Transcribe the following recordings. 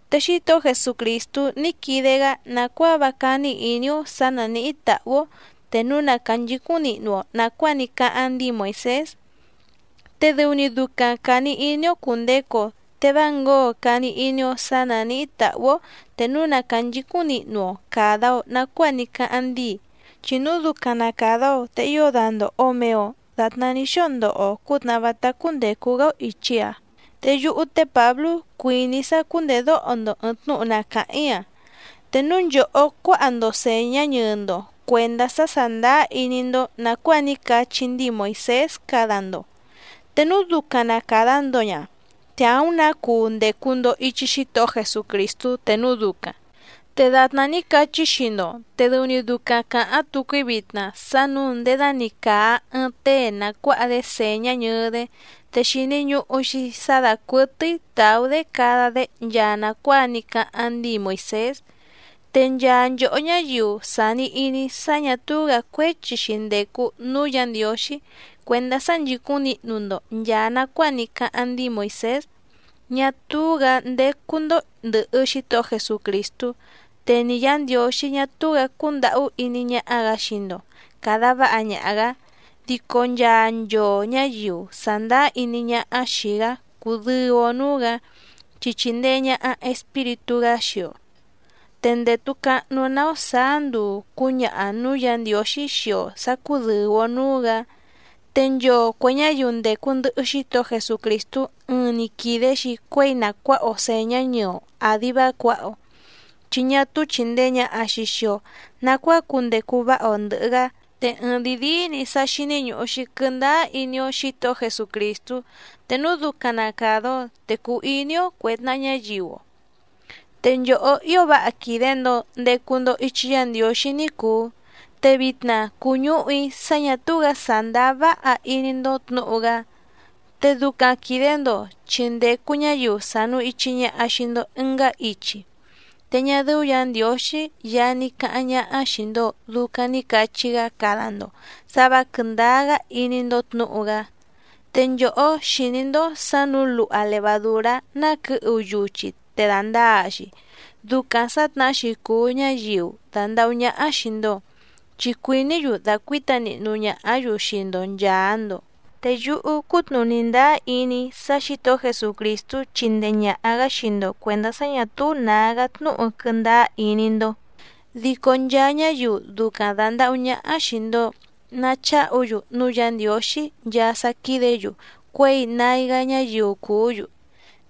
Te Xítohó Jesucrìstú ní quide‑gá nàcuáa vá cání ìní‑ó sǎ nánìhí tàhú‑ó te núu na cànchicúⁿ nihnu‑o nàcuáa ní cáháⁿ ndíi Moìsés, te dɨu‑ni ducaⁿ càni iní‑ó cùndecu‑o te vá ngǒo càni iní‑ó sǎ nánìhí tàhú‑ó te núu na cànchicúⁿ nihnu‑o càda‑o nacuáa ní cáháⁿ ndíi, chi núu ducaⁿ na càda‑o te ío dandòho‑o mee‑o datná ní xóo ndoho‑o cǔtnàhá vátá cúndècu‑gá‑ó ìchi‑a. Te yúhú té Pǎblú cuìní‑í sá cùndedóho‑ndo ɨ̀ɨⁿ tnúhu na càháⁿ‑í‑a. Te núu nchòhó cuáha‑ndo sèñá ñɨɨ‑ndo cuèndá sá sàndáá iní‑ndó nàcuáa ní cachí ndíi Moìsés cada‑ndo, te núu ducaⁿ na càda‑ndo ña, te àúⁿ nǎ cuu ndècu‑ndo ichi Xítohó Jesucrìstú te núu ducaⁿ. Te dàtná ní cachí‑í xii‑ndo, te dɨu‑ni ducaⁿ càháⁿ tucu‑í vitna sá nǔu nděda‑ni càa ɨɨⁿ tée na cuǎha‑dé sèñá ñɨɨ‑dé, te xìni ñuhu‑xi sá dàcuɨtɨ́í tàú‑dé cada‑dé nchaa nàcuáa ní cáháⁿ ndíi Moìsés. Te nchaa nchòhó ñáyiu sàni iní sá ñà túú‑gǎ cuéchi‑xi ndècu núú Yǎ Ndiǒxí cuèndá sá nchìcúⁿ nihnu‑ndo nchàa nacuáa ní cáháⁿ ndíi Moìsés, ñá túú‑gǎ ndécú‑ndó ndɨ̀hɨ Xítohó Jesucrìstú, te ni Yǎ Ndiǒxí ñá túú‑gǎ cúndàhú iní ñáhá‑gǎ xii‑ndo càda váha ñaha‑gǎ. Dico nchaa nchoo ñǎyiu sàndáá iní ñáhá xìi‑gá cùdɨu‑o núú‑gǎ, chi chìndee ñaha Espíritú‑gá xii‑o, te ndètu cahnu‑ná‑ó sàá nduu cǔñaha nǔú Yǎ Ndiǒxí xii‑o sǎ cúdɨ̀u‑o núú‑gǎ. Te nchoo cuè ñáyiu ndècu ndɨhɨ Xítohó Jesucrìstú ɨɨⁿ‑ni quìde‑xi cuéi na cuǎha‑o sèñá ñɨɨ‑o àdi vá cuǎha‑o, chi ñá túú chìndee ñaha‑xi xii‑o nacuáa cundecu váha‑o ndɨ̀hɨ‑gá. Te ɨɨⁿdìi díí‑ni sá xíní ñùhu‑xi quɨndáá iní‑ó Xǐtohó Jesucrìstú, te núu ducaⁿ na càda‑o te cuu iní‑ó cuè tnaha ñáyiu‑o. Te nchòhó ío váha quìde‑ndo ndecu‑ndo ichi Yá Ndiǒxí ní cùu, te vitna cùñúhu‑í sá ñà túú‑gǎ sàndáá váha iní‑ndó tnǔhu‑gá, te ducaⁿ quìde‑ndo chi ndècu ñáyiu sànu ichi ñaha xii‑ndo ɨngá ichi. Te ñá dɨ́ú Yǎ Ndiǒxí Yaá ní cáháⁿ ñáhá xìi‑ndo ducaⁿ ni cachí‑gá cada‑ndo sǎ vǎ quɨ̀ndáá‑gá iní‑ndó tnǔhu‑gá. Te nchòhó xìní‑ndó sǎ nǔu luha levadùrá ná quɨ̌hu yuchi te dàndaa‑xi. Ducaⁿ sǎtnahá‑xi cùu ñáyiu dàndahú ñáhá xìi‑ndo, chi cuìní‑yu dàcuíta nihnu ñàhá‑yu xii‑ndo nchàa‑ndo. Te yúhú cútnùní ndáá iní‑í sá Xǐtohó Jesucrìstú chindee ñàha‑gá xii‑ndo cuèndá sá ñǎ túú nǎgá tnúhu quɨndáá iní‑ndó, dico nchaa ñáyiu ducaⁿ dàndahú ñáhá xìi‑ndo nacháhu‑yu núú Yǎ Ndiǒxí nchaa sá quídě‑yu cuěi nái‑gá ñáyiu cùú‑yu.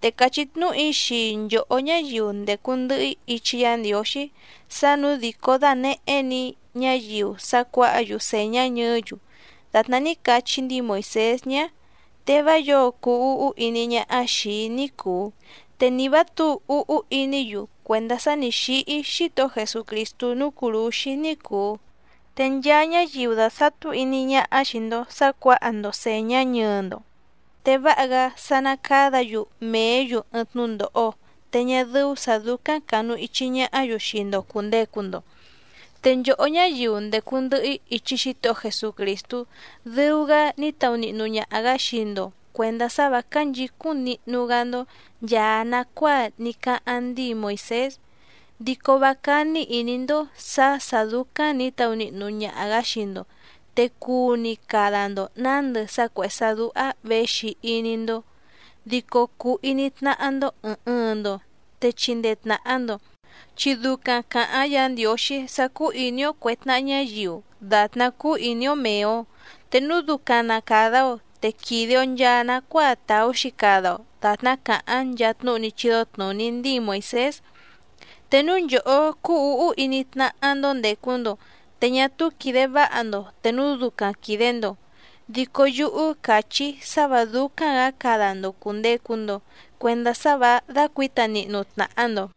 Te càchí tnúhu‑í xii nchòhó ñáyiu ndècu ndɨhɨ‑í ichi Yá Ndiǒxí sá nǔu dìcó dànehé‑ni‑í ñáyiu sá cuǎha‑yu sèñá ñɨɨ́‑yu dàtná ní cachí ndíi Moìsés ñá, te vá yǒo cuu úhú iní ñáhá xìi‑í ní cùu, te ni vǎ tǔu úhú iní‑yu cuèndá sá nǐ xíhí Xítohó Jesucrìstú núú cùrúxí ní cùu. Te nchaa ñáyiu dàsatú iní ñáhá xii‑ndo sǎ cuǎha‑ndo sèñá ñɨɨ‑ndo, te váha‑gá sá ná cádǎ‑yu mèé‑yu ɨɨⁿ tnúndòho, te ñá dɨ́ú sǎ dúcáⁿ cànuichi ñahá‑yu xii‑ndo cùndecu‑ndo. Te nchòhó ñáyiu ndècu ndɨhɨ‑í ichi Xítohó Jesucrìstú dɨu‑gá ní taunihnu ñaha‑gǎ xii‑ndo cuèndá sá vǎ cánchìcúⁿ nihnu‑gá‑ndó nchàa nacuáa ní cáháⁿ ndíi Moìsés, dico vá cání ìní‑ndó sǎ sǎ dúcáⁿ nǐ taunihnu ñaha‑gǎ xii‑ndo, te cuu‑ni cada‑ndo nǎndɨ sá cuèhé sá dúhá věxi iní‑ndó, dico cuu iní tnáhá‑ndó ɨ̀ɨⁿ ɨɨⁿ‑ndo te chindee tnàha‑ndo. Chi ducaⁿ càháⁿ Yǎ Ndiǒxí sá cúú ìní‑ó cuè tnaha ñáyiu dàtná cúú ìní‑ó mèe‑o. Te núu ducaⁿ na càda‑o, te quìde‑o nchaa nacuáa tàú‑xi cada‑o dàtná càháⁿ nchaa tnúhu ní chídó tnùní ndíi Moìsés. Te núu nchòhó cúú ǔhú iní tnáhá‑ndó ndècu‑ndo, te ñá túú quìde váha‑ndo te núu ducaⁿ quìde‑ndo, dico yúhú càchí‑í sá vǎ dúcáⁿ‑gǎ cada‑ndo cùndecu‑ndo cuendá sá vǎ dácuǐta nihnu tnàha‑ndo.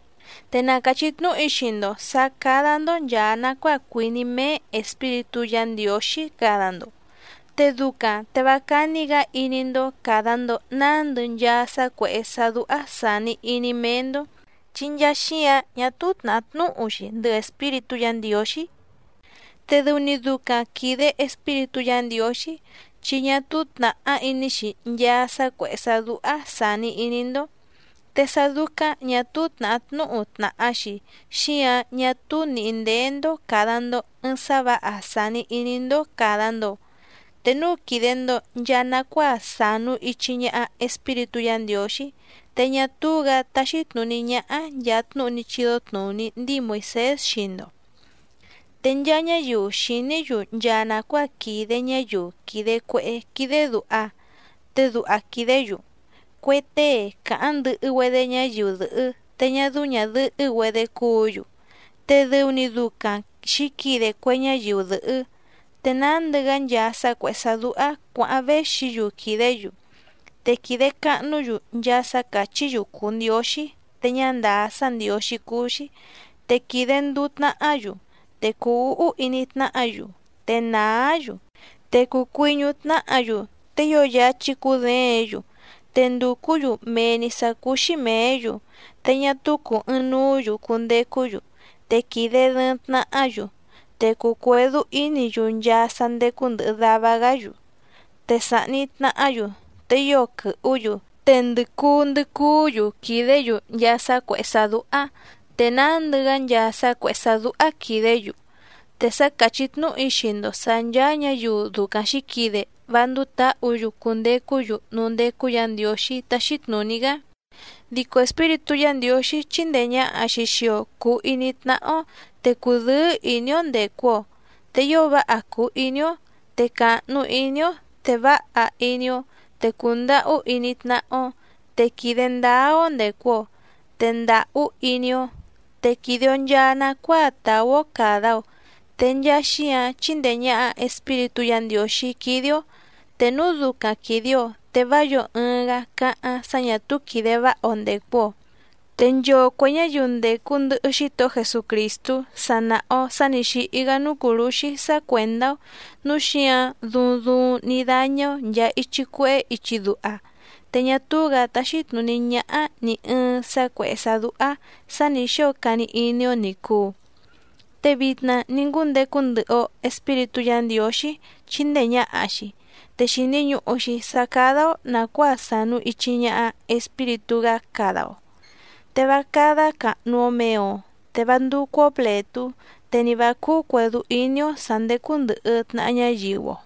Te na càchí tnúhu‑í xii‑ndo sǎ cádá‑ndó nchàa nacuáa cuìní méé Espíritú Yǎ Ndiǒxí cada‑ndo, te ducaⁿ te vá cání‑gǎ iní‑ndó càda‑ndo nándɨ nchaa sá cuèhé sá dúhá sàni iní méé‑ndó. Chi nchaa xíǎⁿ ñá túú tnàhá tnúhu‑xi ndɨhɨ Espíritú Yǎ Ndiǒxí. Te dɨu‑ni ducaⁿ quìde Espíritú Yǎ Ndiǒxí, chi ñá túú tnàhá iní‑xi nchaa sá cuèhé sá dúhá sàni iní‑ndó. Te sá dúcáⁿ ñà túú tnàhá tnúhu tnàha‑xi xíǎⁿ ñá túú nìhí ndéé‑ndó càda‑ndo ɨɨⁿ sá vǎha sàni iní‑ndó càda‑ndo. Te núu quìde‑ndo nchaa nacuáa sànu ichi ñaha Espíritú Yǎ Ndiǒxí, te ñá túú‑gǎ táxí tnùní ñáhá nchàa tnúhu ní chídó tnùní ndíi Moìsés xii‑ndo. Te nchaa ñáyiu xìní‑yu nchaa nàcuáa quìde ñáyiu quìde cuehé quídé dùha. Te duha quìdé‑yu: Cue tée càháⁿ ndɨhɨ‑güedé ñáyiu dɨ̀hɨ́ te ñá dɨ́ú ñàdɨhɨ́‑güedé cúǔ‑yu, te dɨu‑ni ducaⁿ xǐquide cue ñáyiu dɨ̀hɨ́, te nándɨ‑gá nchaa sá cuèhé sá dúhá cuǎháⁿ véxi‑yu quìdé‑yu. Te quìde cahnú‑yu nchaa sá càchí‑yu cùu ndióxí te ñá ndàá sá ndiǒxí cúú‑xí, te quìde nduu tnahá‑yu, te cùu úhú iní tnáhǎ‑yu, te nàá‑yu, te cùu cuiñú tnáhǎ‑yu, te ío yáchí cúděěⁿ‑yu, te ndùcú‑yu mee‑ni sǎ cúú‑xí mèé‑yu, te ñá túú cùu ɨɨⁿnuú‑yu cundecú‑yu, te quìde dɨɨⁿ tnahá‑yu. Te cùu cuedú ínǐ‑yu nchaa sá ndécú ndɨ̀hɨ dava‑gá‑yu, te sàhni tnahá‑yu, te ío quɨhú‑yu, te ndɨ̀ cuu ndɨ cuú‑yu quìdé‑yu nchaa sá cuèhé sá dúhá, te nándɨ‑gá nchaa sá cuèhé sá dúhá quìdé‑yu. Te sa càchí tnúhu‑í xii‑ndo sǎ ncháá ñǎyiu ducaⁿ xǐquide vá ndúú tǎhǔ‑yu cundecú‑yu núú ndécú Yǎ Ndiǒxí táxí tnùní‑gá. Dico Espíritú Yǎ Ndiǒxí chíndèe ñaha‑xi xii‑o cuu iní tnáhá‑ó, te cùdɨ́ɨ́ ìní‑ó ndècu‑o, te ío váha cùu iní‑ó, te càhnu iní‑ó, te váha iní‑ó, te cùndahú iní tnáhá‑ó, te quìde ndáá‑ó ndècu‑o. Te ndàhú iní‑ó, te quìde‑o nchaa nacuáa tàú‑ó càda‑o, te nchaa xíǎⁿ chíndèe ñaha Espíritú Yǎ Ndiǒxí quídé‑ó, te núu ducaⁿ quìde‑o, te vá yǒo ɨɨⁿ‑gá cáháⁿ sá ñà túú quìde váha‑o ndècu‑o. Te nchoo cuè ñáyiu ndècu ndɨhɨ Xítohó Jesucrìstú, sa nàha‑o sá nǐ xíhí‑gá núú cùrúxí sá cuèndá‑ó, núu xíǎⁿ duuⁿ duuⁿ ní dáñá‑ó nchàa ichi cuehé ichi duha, te ñá túú‑gǎ táxí tnùní ñáhá nì ɨɨⁿ sá cuèhé sá dúhá sǎ nǐ xóo cani iní‑ó ní cùu. Te vitna ní ngúndecu ndɨhɨ‑o Espíritú Yǎ Ndiǒxí chíndèe ñaha‑xi, te xìni ñuhu‑xi sá cádá‑ó nàcuáa sànu ichi ñaha Espíritú‑gá cada‑o. Te vá cádá càhnu‑o mee‑o, te vá ndúcú‑ó plètú, te ni vǎ cúú cuèdú iní‑ó sǎ ndécú ndɨ̀hɨ tnaha ñáyiu‑o.